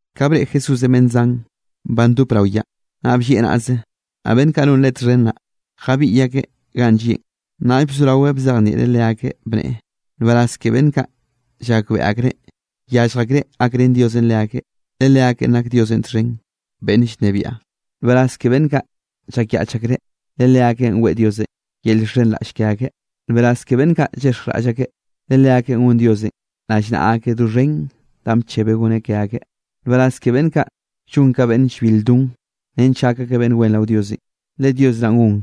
Ka breꞌe Jesúsenꞌ beꞌnn zan ba ndop rao yaꞌn, naꞌ bllieꞌ naꞌze, naꞌ beꞌnn kaꞌ non Leꞌe txhen naꞌ, jabiꞌy akeꞌ ganꞌ llieꞌn. Naꞌll bzoraweꞌ bzejnieꞌreꞌ leakeꞌ, bneꞌe: —Nbaraz ke beꞌnn kaꞌ llakbeꞌe akreꞌ yallj akreꞌ gakrén Diosenꞌ leakeꞌ, le leakeꞌn nak Diosenꞌ txhen beꞌnn llnebiaꞌ. ’Nbaraz ke beꞌnn kaꞌ llakyaꞌch akreꞌ, le leakeꞌn weꞌe Diosenꞌ yel llxhenraꞌll ke akeꞌ. ’Nbaraz ke beꞌnn kaꞌ llexjraꞌll akeꞌ, le leakeꞌn gon Diosenꞌ rallnaꞌa akeꞌ doxhen danꞌ bchebeꞌ goneꞌ ke akeꞌ. ’Nbaraz ke beꞌnn kaꞌ llon ka beꞌnn llbil don, nench gak akeꞌ beꞌnn wen rao Diosenꞌ, le Dios naꞌn gon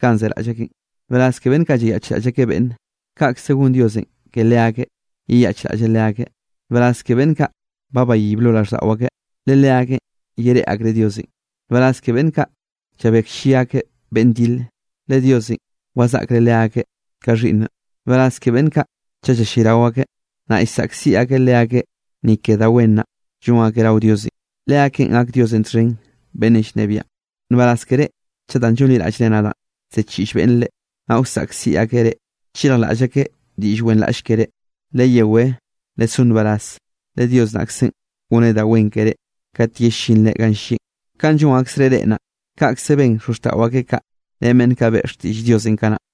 kanꞌ zeraꞌll akeꞌn. ’Nbaraz ke beꞌnn kaꞌ llayaꞌchraꞌll akeꞌ beꞌnne, kaꞌkze gon Diosenꞌ ke leakeꞌ yeyaꞌchraꞌlleꞌ leakeꞌ. ’Nbaraz ke beꞌnn kaꞌ ba bayib lo raꞌlldaꞌo akeꞌ, le leakeꞌn yereꞌe akreꞌ Diosenꞌ. ’Nbaraz ke beꞌnn kaꞌ llabeklli akeꞌ beꞌnn dile, le Diosenꞌ wazaꞌkreꞌ leakeꞌ ka xhiꞌnneꞌ. ’Nbaraz ke beꞌnn kaꞌ chaꞌ llallayrao akeꞌ, naꞌ llsaꞌkziꞌ akeꞌ leakeꞌ ni ke da wen naꞌ llon akeꞌ rao Diosenꞌ, leakeꞌn gak Diosenꞌ txhen beꞌnnenꞌ llnebiaꞌn. ’Nbaraz ke reꞌ chaꞌ danꞌ llonliraꞌllre nadaꞌn ziꞌchiꞌll beꞌnne reꞌ, naꞌ wsaꞌkziꞌ akeꞌ reꞌ, chirjlaꞌll akeꞌ diꞌll wenraꞌll keré. Leyewé lesó nbaraz, le Dios naꞌkze goneꞌ da wen keré kate yellinre ganꞌ llieꞌn. Kanꞌ llon aksreꞌ reꞌ naꞌ, kaꞌkze ben xozxtaꞌo akeꞌ kaꞌ ren beꞌnn kaꞌ beꞌe xtiꞌll Diosenꞌ kanaꞌ.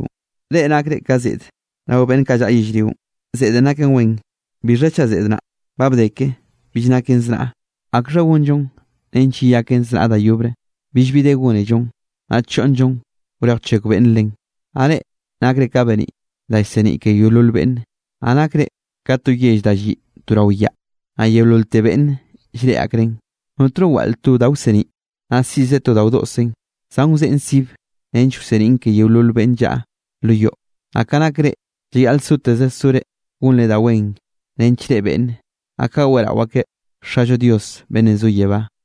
’Reꞌ nakre ka zeꞌde rao beꞌnn kaꞌ llaꞌa yellrionꞌ. Zeꞌdenꞌ naken wen, bixha chaꞌ zeꞌd naꞌ ba bde ke bill naken znaꞌ, ¿akxha gonllon nench yeyaken znaꞌ da yobre? Billbi de gónellon, naꞌ choꞌnnllon wrej wchekw beꞌnn len. ’Naꞌ reꞌ nakre ka beniꞌ da llseniꞌ ke yeolol beꞌnne. Naꞌ nakre ka to yell da lliꞌ to rao yaꞌ, naꞌ yeololte beꞌnne llreꞌe akreꞌn. Notno waꞌl to da wseniꞌ, naꞌ siꞌzeꞌ to da wdoꞌseꞌn, zan wzeꞌen sibe nench wseniꞌn ke yeolol beꞌnn llaꞌa lo yoꞌ. Naꞌ ka nak reꞌ llayaꞌl soteze sore gonre da wen nench reꞌe beꞌnne, naꞌ kaꞌ weꞌrao akeꞌ Xallo Dios beꞌnn zo yebá.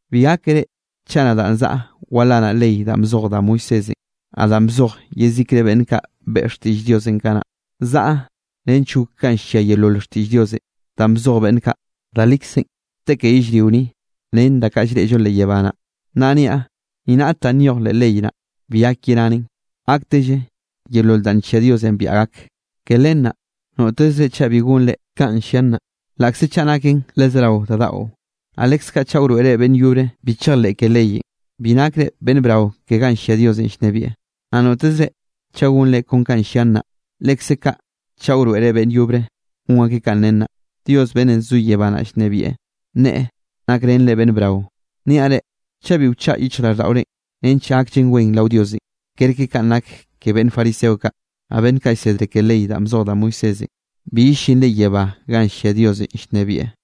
’Bi gákere chaꞌ nadaꞌ zaꞌa walanaꞌ ley danꞌ bzoj da Moisésenꞌ, naꞌ danꞌ bzoj yezikre beꞌnn kaꞌ beꞌe xtiꞌll Diosenꞌ kanaꞌ. Zaꞌa nench gok kanꞌ llia yeolol xtiꞌll Diosenꞌ danꞌ bzoj beꞌnn kaꞌ. Da likzenꞌ te ke yellrio ni, ren da kaꞌ llreꞌllo leꞌ yebá naꞌ, naꞌ niaꞌ, ni raꞌt danꞌ nyoj leꞌ ley naꞌ, bi gak yeranen, gaktelle yeolol danꞌ nllia Diosenꞌ biaꞌa gak. Ke len naꞌ notezre chaꞌ bi gonre kanꞌ llian naꞌ, laꞌkze chaꞌ naken le zerao da daꞌo, naꞌ leskaꞌ chaꞌ wroeꞌre beꞌnn yobre bi chejleꞌ ke leyenꞌ, bi nakre beꞌnn brao ke ganꞌ llia Diosenꞌ llnebieꞌ. Naꞌ notezre chaꞌ gonre kon kanꞌ llian naꞌ, lekze kaꞌ chaꞌ wroeꞌre beꞌnn yobre gon akeꞌ kanꞌ nen naꞌ, Dios beꞌnnenꞌ zo yebá naꞌ llnebieꞌ, nneꞌe nakrenre beꞌnn brao. Niaꞌ reꞌ, chaꞌ bi wchaꞌa yichjraꞌlldaꞌorenꞌ nench gakllen wen rao Diosenꞌ, kerke kanꞌ nak ke beꞌnn fariseo kaꞌ, naꞌ beꞌnn kaꞌ llsedre ke ley danꞌ bzoj da Moisésenꞌ, bi yellinre yebá ganꞌ llia Diosenꞌ llnebieꞌ.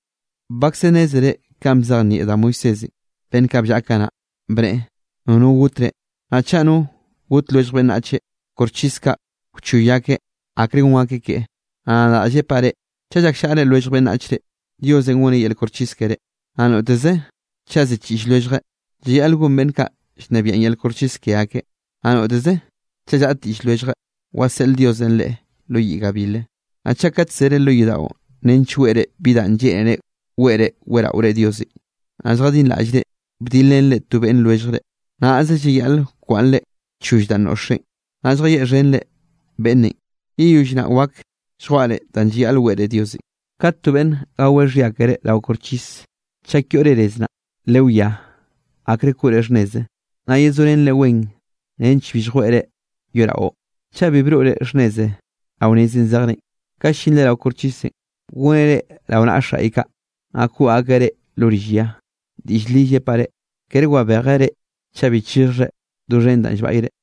’Bakze nnézere kanꞌ bzejnieꞌ da Moisésenꞌ beꞌnn kaꞌ bllaꞌa kanaꞌ, bneꞌe: “Nono gotre. Naꞌ chaꞌ no gote lwellj beꞌnnache, koxchis kaꞌ wchoy akeꞌ akre gon akeꞌ keꞌe.” Naꞌ nadaꞌ llepaꞌ reꞌ, chaꞌ llakllaꞌre lwellj beꞌnnachre, Diosenꞌ goneꞌ yel koxchis keré. Naꞌ notezeꞌ chaꞌ ziꞌchiꞌll lwelljeꞌ, llayaꞌl gon beꞌnn kaꞌ llnebiaꞌn yel koxchis ke akeꞌ. Naꞌ notezeꞌ chaꞌ llaꞌd diꞌll lwelljeꞌ, waseꞌl Diosenꞌ leꞌe lo yiꞌ gabil. ’Naꞌ chaꞌ kat zere lo yodaꞌon nench weꞌre bi danꞌ lleꞌnere weꞌre weꞌraore Diosenꞌ, naꞌ lljadinraꞌllre bdilrenre to beꞌnn lwelljre, naꞌze llayaꞌle wkwaꞌnnre choll danꞌ noꞌxre, naꞌll lljayeꞌxhenre beꞌnnenꞌ. Yeyoll naꞌ wak lljwaꞌre danꞌ llayaꞌl weꞌre Diosenꞌ. ’Kate to beꞌnne gaweꞌ xhia keré rao koxchis, chak yoꞌre nez naꞌ, lewiá akre koꞌre xhnneze, naꞌ yezorenreꞌ wen nench bi lljweꞌe reꞌ yoraꞌo. Chaꞌ bi broꞌre xhnneze rao nezenꞌ zejrenꞌ, ka llinre rao koxchisenꞌ, goneꞌ reꞌ rao naꞌa xaꞌy kaꞌ, naꞌ koꞌ akeꞌ reꞌ lo rill ya. Diꞌll li llepaꞌ reꞌ, kere wabejeꞌ reꞌ chaꞌ bi chixhjre doxhen danꞌ llbaꞌyre.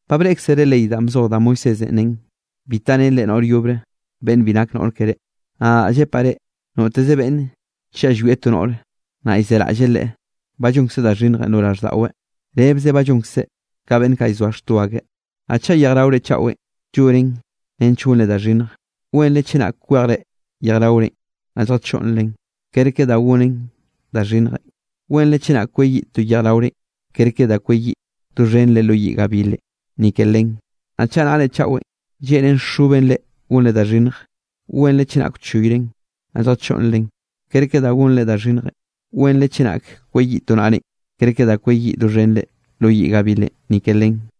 ’Ba breꞌkzere ley danꞌ bzoj da Moisésenꞌ nen: “Bi tarenre noꞌr yobre beꞌnn bi nak noꞌr keré.” Naꞌ nadaꞌ llepaꞌ reꞌ, noteze beꞌnne chaꞌ llwieꞌ to noꞌre, naꞌ llzeraꞌlleꞌ leꞌe, ba llonkzeꞌ da xhinnjenꞌ lo raꞌlldaꞌweꞌ, rebze ba llonkzeꞌ ka beꞌnn kaꞌ llzoa xto akeꞌ. ’Naꞌ chaꞌ yejraore chaꞌwenꞌ llonen nench gonre da xhinnje, wenre chenak kwejre yejraorenꞌ naꞌ lljachoꞌnnren, kerke da gonre da xhinnjenꞌ. Wenre chenak kweyiꞌ to yejraorenꞌ, kerke da kweyiꞌ doxhenre lo yiꞌ gabilenꞌ ni ke len. Naꞌ chaꞌ naꞌrenꞌ chaꞌwenꞌ lleꞌnen xoben reꞌ gonre da xhinnje, wenre chenak wchoyren naꞌ lljachoꞌnnren, kerke da gonre da xhinnjenꞌ. Wenre chenak kweyiꞌ to naꞌrenꞌ, kerke da kweyiꞌ doxhenre lo yiꞌ gabilenꞌ ni ke len.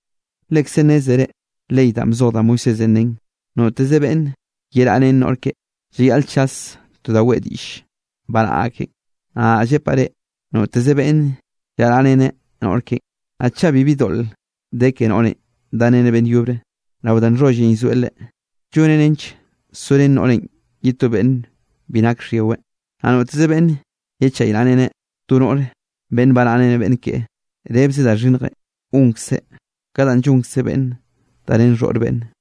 ’Lekze nnézere ley danꞌ bzoj da Moisésenꞌ nen: “Noteze beꞌnn yeraꞌa ren noꞌr keꞌe, llayaꞌl chas to da weꞌe diꞌll baraꞌ akeꞌn.” Naꞌ nadaꞌ llepaꞌ reꞌ noteze beꞌnn llaraꞌreneꞌ noꞌr keꞌen, naꞌ chaꞌ bibi doꞌl de ke noꞌrenꞌ dareneꞌ beꞌnn yobre, rao da nxhollenꞌ llzoeꞌ leꞌe, lloneꞌ nench sorén noꞌrenꞌ ye to beꞌnn bi nak xhyiweꞌ. Naꞌ noteze beꞌnn yechaynaꞌreneꞌ to noꞌre beꞌnn baraꞌa ren beꞌnn keꞌe, rebze da xhinnjenꞌ gonkzeꞌ ka danꞌ llonkze beꞌnnenꞌ darén xhoꞌr beꞌnne.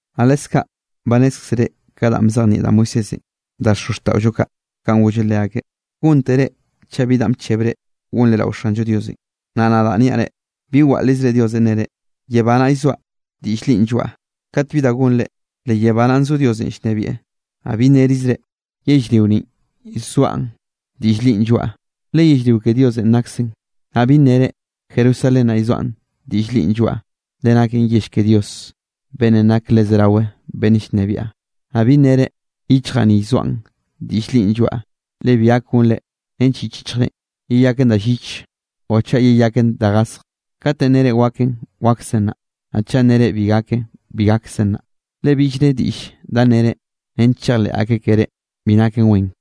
’Naꞌ leskaꞌ ba nnézkzere ka danꞌ bzejnieꞌ da Moisésenꞌ da xozxtaꞌollo kaꞌ kanꞌ golleꞌ leakeꞌ: “Góntere chaꞌ bi danꞌ bchebre gonre rao Xanllo Diosenꞌ.” Naꞌ nadaꞌ niaꞌ reꞌ, bi waꞌlrizre Diosenꞌ nere: “Yebá naꞌ llzoaꞌ diꞌll linꞌ lloaꞌa”, kat bi da gonre, le yebá naꞌn zo Diosenꞌ llnebieꞌ. Naꞌ bi nnerizre: “Yellrio ninꞌ llzoaꞌn diꞌll linꞌ lloaꞌa”, le yellrionꞌ ke Dios naꞌkzenꞌ. Naꞌ bi nnere: “Jerusalén naꞌ llzoaꞌn diꞌll linꞌ lloaꞌa”, le naken yell ke Dios beꞌnn nake le zerawe beꞌnne llnebiaꞌ. Naꞌ bi nnere: “Yichjaꞌ ni llzoaꞌn diꞌll linꞌ lloaꞌa”, le bi gak gonre nench yich yichjrenꞌ yeyaken da lliche o chaꞌ yeyaken da gasje. Kat nnere waken, waksen naꞌ; naꞌ chaꞌ nere bi gaken, bi gaksen naꞌ. Le billre diꞌll da nnere nench chejleꞌ akeꞌ ke reꞌ bi naken wen.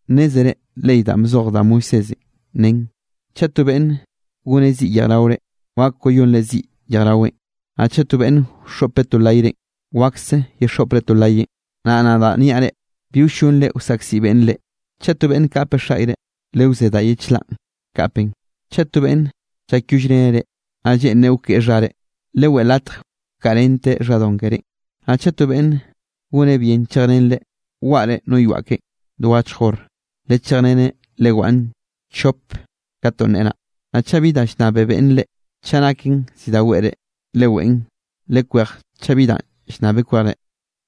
’Nnézere ley danꞌ bzoj da Moisésenꞌ nen: “Chaꞌ to beꞌnn goneꞌ ziꞌ yejraorenꞌ, wak wayonre ziꞌ yejraweꞌn, naꞌ chaꞌ to beꞌnne wxoꞌpeꞌ to layrenꞌ, wakse yexoꞌpre to layeꞌn.” Naꞌ nadaꞌ niaꞌ reꞌ: Bi wllonre wsaꞌkziꞌ beꞌnne reꞌ. Chaꞌ to beꞌnne kapeꞌ xaꞌyre, lewzé da ye chlaꞌn kapeꞌn. Chaꞌ to beꞌnne llakyollreneꞌ reꞌ, naꞌ lleꞌnreꞌ wkeꞌe xhare, leweꞌe latje wkaꞌrenteꞌ xhadon kerénꞌ. Naꞌ chaꞌ to beꞌnn goneꞌ bien chejrenreꞌ waꞌre no yoaꞌ keꞌen do achj hor, lechejreneꞌ lewaꞌn chop ka ton neꞌe naꞌ. Naꞌ chaꞌ bi danꞌ llnnabe beꞌnne reꞌ, chaꞌ naken zi da weꞌre, leweꞌn; lekwej chaꞌ bi danꞌ llnnabeꞌ kwejreꞌ.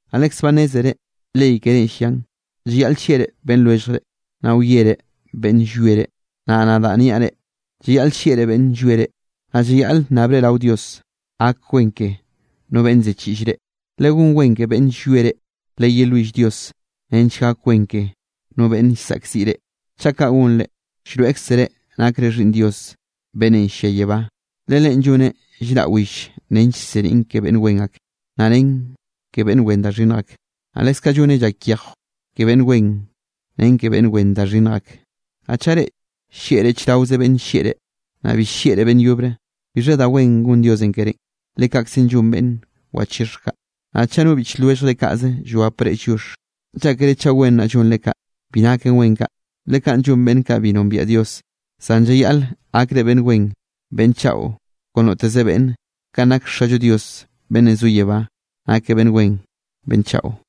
’Naꞌ lekze ba nnézere ley kerénꞌ llian: “Llayaꞌl llieꞌre beꞌnn lwelljre, naꞌ wiere beꞌnn llwie reꞌ.” Naꞌ nadaꞌ niaꞌ reꞌ, llayaꞌl llieꞌre beꞌnnenꞌ llwie reꞌ, naꞌ llayaꞌle nnabre rao Dios gak wen ke no beꞌnne ziꞌchiꞌll reꞌ. Legón wen ke beꞌnne llwie reꞌ, leyelwill Dios nench gak wen ke no beꞌnn llsaꞌkziꞌ reꞌ. Chaꞌ kaꞌ gonre, llroeꞌkzere nakre xhiꞌnn Dios beꞌnnenꞌ llia yebá. Le Leꞌen lloneꞌ llraꞌ will nench llseniꞌn ke beꞌnn wen ak, naꞌ ren ke beꞌnn wen da xhinnj ak. Naꞌ leskaꞌ lloneꞌ llak yejw ke beꞌnn wen ren ke beꞌnn wen da xhinnj ak. Naꞌ chaꞌ reꞌ llieꞌre chraoze beꞌnne llieꞌ reꞌ, naꞌ bi llieꞌre beꞌnn yobre, ¿bixha da wen gon Diosenꞌ kerénꞌ? Le kaꞌkze llon beꞌnn wachixhj kaꞌ. Naꞌ chaꞌ no biꞌch lwelljre kaꞌze llwapre lliox, ¿llákere chaꞌ wen naꞌ llonre kaꞌ? Bi naken wen kaꞌ, le kaꞌn llon beꞌnn kaꞌ bi nombiaꞌ Dios. Zan llayaꞌl gakre beꞌnn wen beꞌnn chaꞌo kon noteze beꞌnne, kanꞌ nak Xallo Dios beꞌnn zo yebá nakeꞌ beꞌnn wen beꞌnn chaꞌo.